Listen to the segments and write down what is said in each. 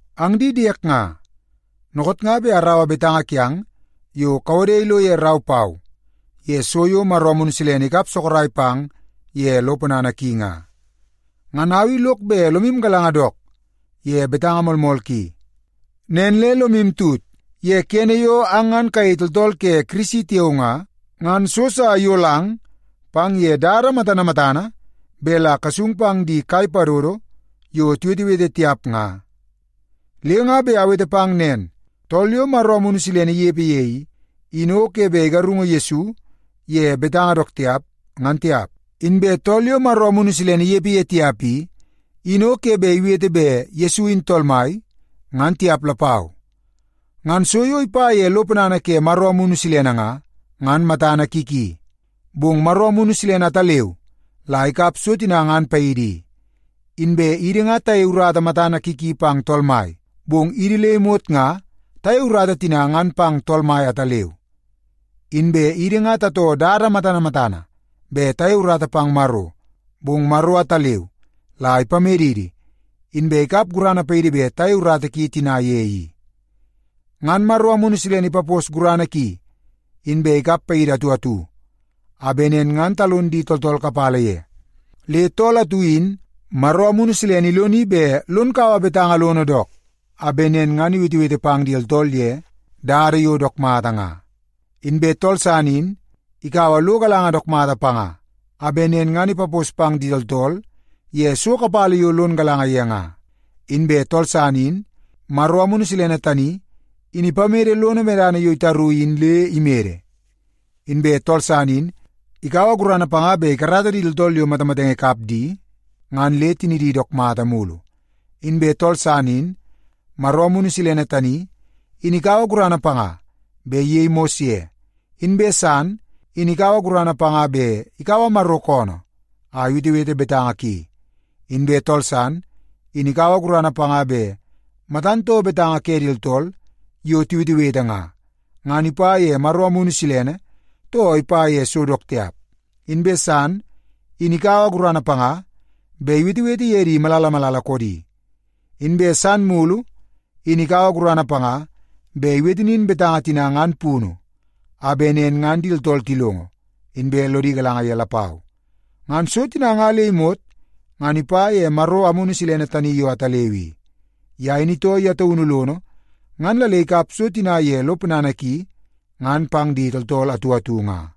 Ang di diek nga, dookoot nga bet araua betanga kiang yo kawode ilo ye rau pau ye so yo Maro Amunu Silene ikap sorok pang ye lo ponana ki nga. Ngan au i lok bet lomu galanga dook ye betanga moolmool ki. Nen le lomu tut ye kene yo ang ngan kayei tooltool ke Kirisi tiao nga, ngan so sa iyolang pang ye dada matana matana bet la kasung pang di kai padodo yo tiwetewete tiap nga. Le nga bet awete pang nen, tool yo Maro Amunu Silene inepe ye i, in o ke bet igarungu Yesu ye betanga dook tiap, ngan tiap. Inbe tool yo Maro Amunu Silene inepe ye tiap i, in o ke bet iwete bet Yesu in Tool Mai, ngan tiap lapau. Ngan so yo ipa ye lo ponana ke Maro Amunu Silene nga, ngan matana ki ki. Bong Maro Amunu Silene ataleu la ikap so tina ngan paidi i. Inbe idi nga tayei urata matana ki ki pang Tool Mai, bong idi le imot nga tayei urata tina ngan pang Tool Mai ataleu. Inbe idi nga tatoo dada matana matana bet tayei urata pang Maro, bong Maro ataleu la ipamedidi, inbe ikap gurana paidi bet tayei urata ki tina ye i. Ngan Maro Amunu Silene ipapos gurana ki, inbe ikap paidi atu atu, a bet nen ngan talon di tooltool kapala ye. Le tool atu in Maro Amunu Silene iloni bet lon kaua betanga lono dook, a bet nen ngan iwetewete pang di tooltool ye dada yo dook mata nga. Inbe tool san in ikaua lo galanga dook mata panga, a bet nen ngan ipapos pang di tooltool ye so kapala yo lon galanga ye nga. Inbe tool san in Maro Amunu Silene tani in ipamede lono medana yo itaru in le imede. Inbe tool san in ikaua gurana panga bet ikarata di tooltool yo matamatenge ikap di ngan le tinidi dook mata mulu. Inbe tool san, in Maro Amunu Silene tani, in ikaua gurana panga bet iyei mos ye. Inbe san, in ikaua gurana panga bet ikaua Maro koonoo a iwetewete betanga ki. Inbe tool san, in ikaua gurana panga bet matan too betanga ke di tooltool yo tiwetewete nga, ngan ipa ye Maro Amunu Silene, too ipa ye so dook tiap. Inbe san, in ikaua gurana panga bet iwetewete ye di malala malala koodi. Inbe tool san mulu, in ikaua gurana panga bet iwete nin betanga tina ngan punu, a bet nen ngan di tooltool tilongo, inbe lodi galanga ye lapau. Ngan so tina nga le imot ngan ipa ye Maro Amunu Silene tani yo ataleu i. Ye in itoo ye taunu lono ngan la le ikap so tina ye lo ponana ki ngan pang di tooltool atu atu nga.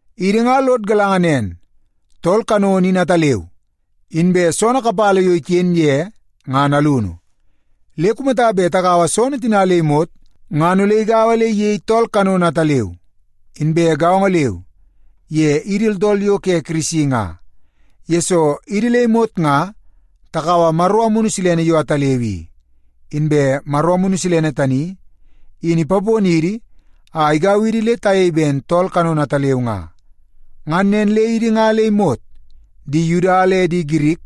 Idi nga lod galanga nen, tool kanono in ataleu, inbe soonoo kapala yo iken ye ngan alunu. Le kumata bet tagaua soonoo tina le imot ngan ole igaua le iyei tool kanono ataleu. Inbe gaongo leu ye idi tooltool yo ke Kirisi nga, yesoo idi le imot nga takaua Maro Amunu Silene yo ataleu i. Inbe Maro Amunu Silene tani in ipaponidi a igau idi le tayei ben tool kanono ataleu nga. Ngan nen le idi nga le imot, di Yuda le di Girik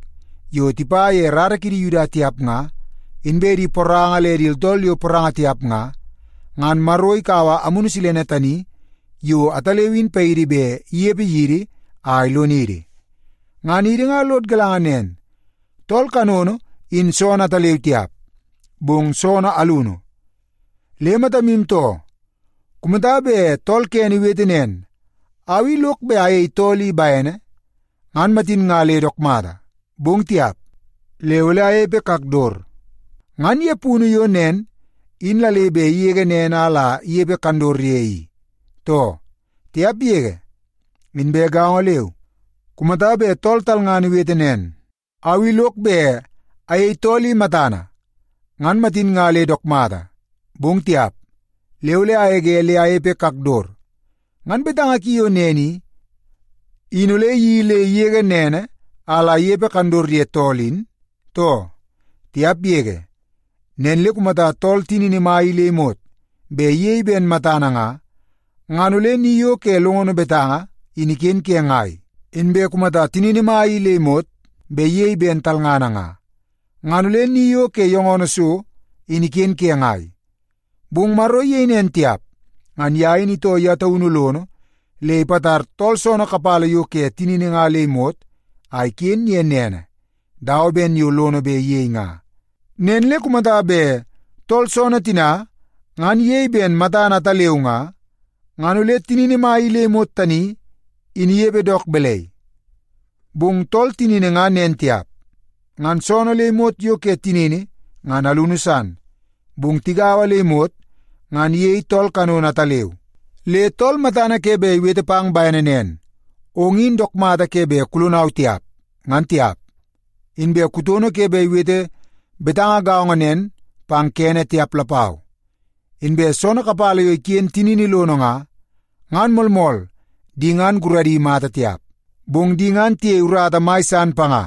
yo tipa ye rara ke di Yuda tiap nga, inbe di poranga le di tooltool yo poranga tiap nga, ngan Maro ikaua Amunu Silene tani yo ataleu in paidi bet inepe yidi a ilonidi. Ngan idi nga lod galanga nen, tool kanono in soonoo ataleu tiap, bong soonoo alunu. Le matamu too! Kumata bet tool kene iwete nen, “Au i lok bet ayei tool i bene, ngan matin nga le dook mata. Bong tiap, le ole anepe kakdot,” ngan ye punu yo nen in la le bet igege nene a la inepe kandot ye i, too? Tiap yege! Inbe gaongo leu kumata bet tool talngana iwete nen, “Au i lok bet ayei tool i matana, ngan matin nga le dook mata. Bong tiap, le ole agege le anepe kakdot,” ngan betanga ki yo nen i, in ole iyeii le igege nene a la inepe kandot ye tool in, too? Tiap yege! Nen le kumata tool tinini mai i le imot bet iyei ben matana nga, ngan ole ni yo ke longono betanga in iken ke ngai? Inbe kumata tinini mai i le imot bet iyei ben talngana nga, ngan ole ni yo ke yongono so in iken ke ngai? Bong Maro iyei nen tiap. Ngan ye in itoo ye taunu lono le ipatar tool soonoo kapala yo ke tinini nga le imot a iken ye nene dawa ben yo lono bet iyei nga. Nen le kumata bet tool soonoo tina ngan iyei ben matana ataleu nga, ngan ole tinini mai le imot tani in inepe dook balai? Bong tool tinini nga nen tiap. Ngan soonoo le imot yo ke tinini ngan alunu san, bong tigaua le imot ngan iyei tool kanono ataleu. Le tool matana ke bet iwete pang bene nen, “Ong in dook mata ke bet kulonau tiap,” ngan tiap. Inbe kutono ke bet iwete betanga gaongo nen pang kene tiap lapau. Inbe soonoo kapala yo iken tinini lono nga, ngan moolmool di ngan guradi mata tiap, bong di ngan tiyei urata mai san panga.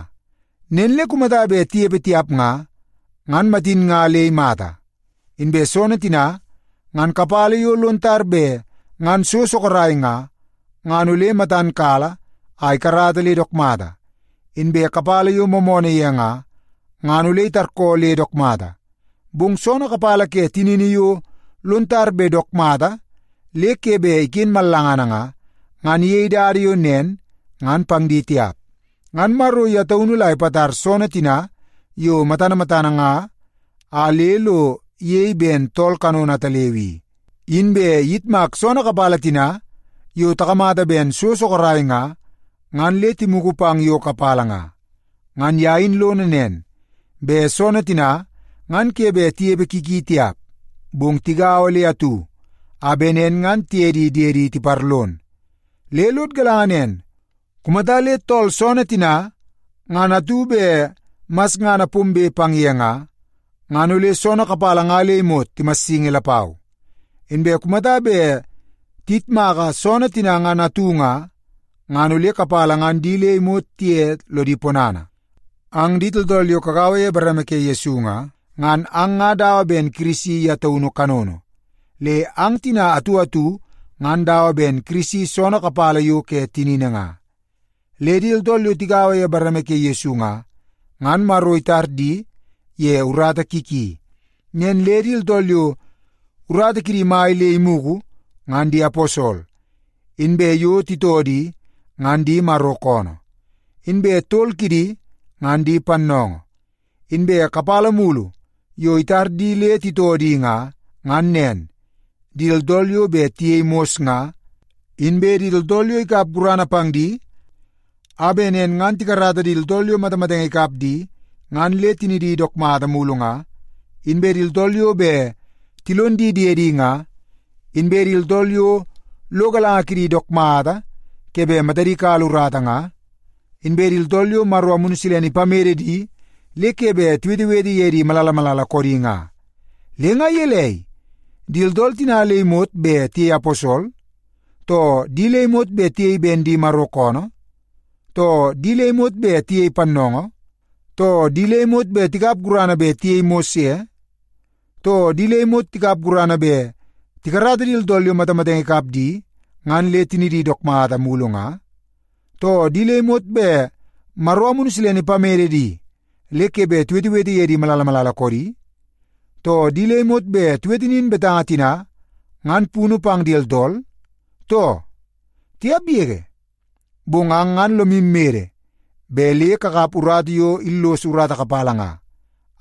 Nen le kumata bet tinepe tiap nga, ngan matin nga le imata. Inbe soonoo tina ngan kapala yo lon tar bet ngan so sorok nga, ngan ole matan kala a ikarata le dook mata. Inbe kapala yo moomoonoo ye nga, ngan ole itarkoo le dook mata. Bong soonoo kapala ke tinini yo lon tar bet dook mata le ke bet iken mallangana nga, ngan iyei dada yo nen ngan pang di tiap. Ngan Maro ye taunu la ipatar soonoo tina yo matana matana nga a le lo iyei ben tool kanono ataleu i. Inbe iyitmak soonoo kapala tina yo takamata ben so sorok nga, ngan le timugu pang yo kapala nga. Ngan ye in lono nen, bet soonoo tina ngan ke bet tinepe ki ki tiap, bong tigaua le atu a bet nen ngan tiye di diedi tiparlon. Le lod galanga nen, kumata le tool soonoo tina ngan atu bet masngana pombe pang ye nga, ngan ole soonoo kapala nga le imot timassingi lapau. Inbe kumata bet tiyitmaka soonoo tina ngan atu nga, ngan ole kapala ngan di le imot tiye lodi ponana. Ang di tooltool yo kagaua ye bareme ke Yesu nga, ngan ang ngan dawa ben Kirisi ye taunu kanono. Le ang tina atu atu ngan dawa ben Kirisi soonoo kapala yo ke tinini nga. Le di tooltool yo tigaua ye bareme ke Yesu nga, ngan Maro itar di ye urata ki ki. Nen le di tooltool yo urata kidi mai le imugu, ngan di aposol, inbe yo titoo di, ngan di Maro koonoo. Inbe tol kidi ngan di pannoongoo. Inbe kapala mulu yo itar di le titoo di nga, ngan nen: Di tooltool yo bet tiyei mos nga; inbe di tooltool yo ikap gurana pang di a bet nen ngan tikarata di tooltool yo matamatenge ikap di ngan le tinidi dook mulu nga; inbe di tooltool yo bet tilon di diedi nga; inbe di tooltool yo lo galanga kidi dook mata ke bet matadi kala urata nga; inbe di tooltool yo Maro Amunu Silene ipamede di le ke bet tiwetewete ye di malala malala koodi nga. Le nga gelei, di tooltool tina le imot bet tiyei aposol, too di le imot bet tiyei ben di Maro koonoo, too di le imot bet tiyei pannoongoo, too di le imot tikap gurana bet tiyei mos ye, too di le imot tikap gurana bet tikarata di tooltool yo matamatenge ikap di ngan le tinidi dook mata mulu nga, too di le imot bet Maro Amunu Silene ipamede di le ke bet tiwetewete ye di malala malala koodi, too di le imot bet tiwete nin betanga tina ngan punu pang di tooltool, too? Tiap yege! Bong ang ngan lomu mede bet le kakap urata yo illos urata kapala nga,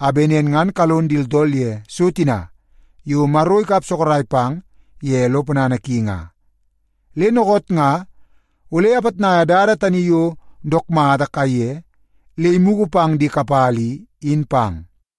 a bet nen ngan kalon di tooltool ye so tina yo Maro ikap sorok pang ye lo ponana ki nga. Le dookoot nga ole apitnaia dada tani yo dook mata kaiye le imugu pang di kapala i, in pang.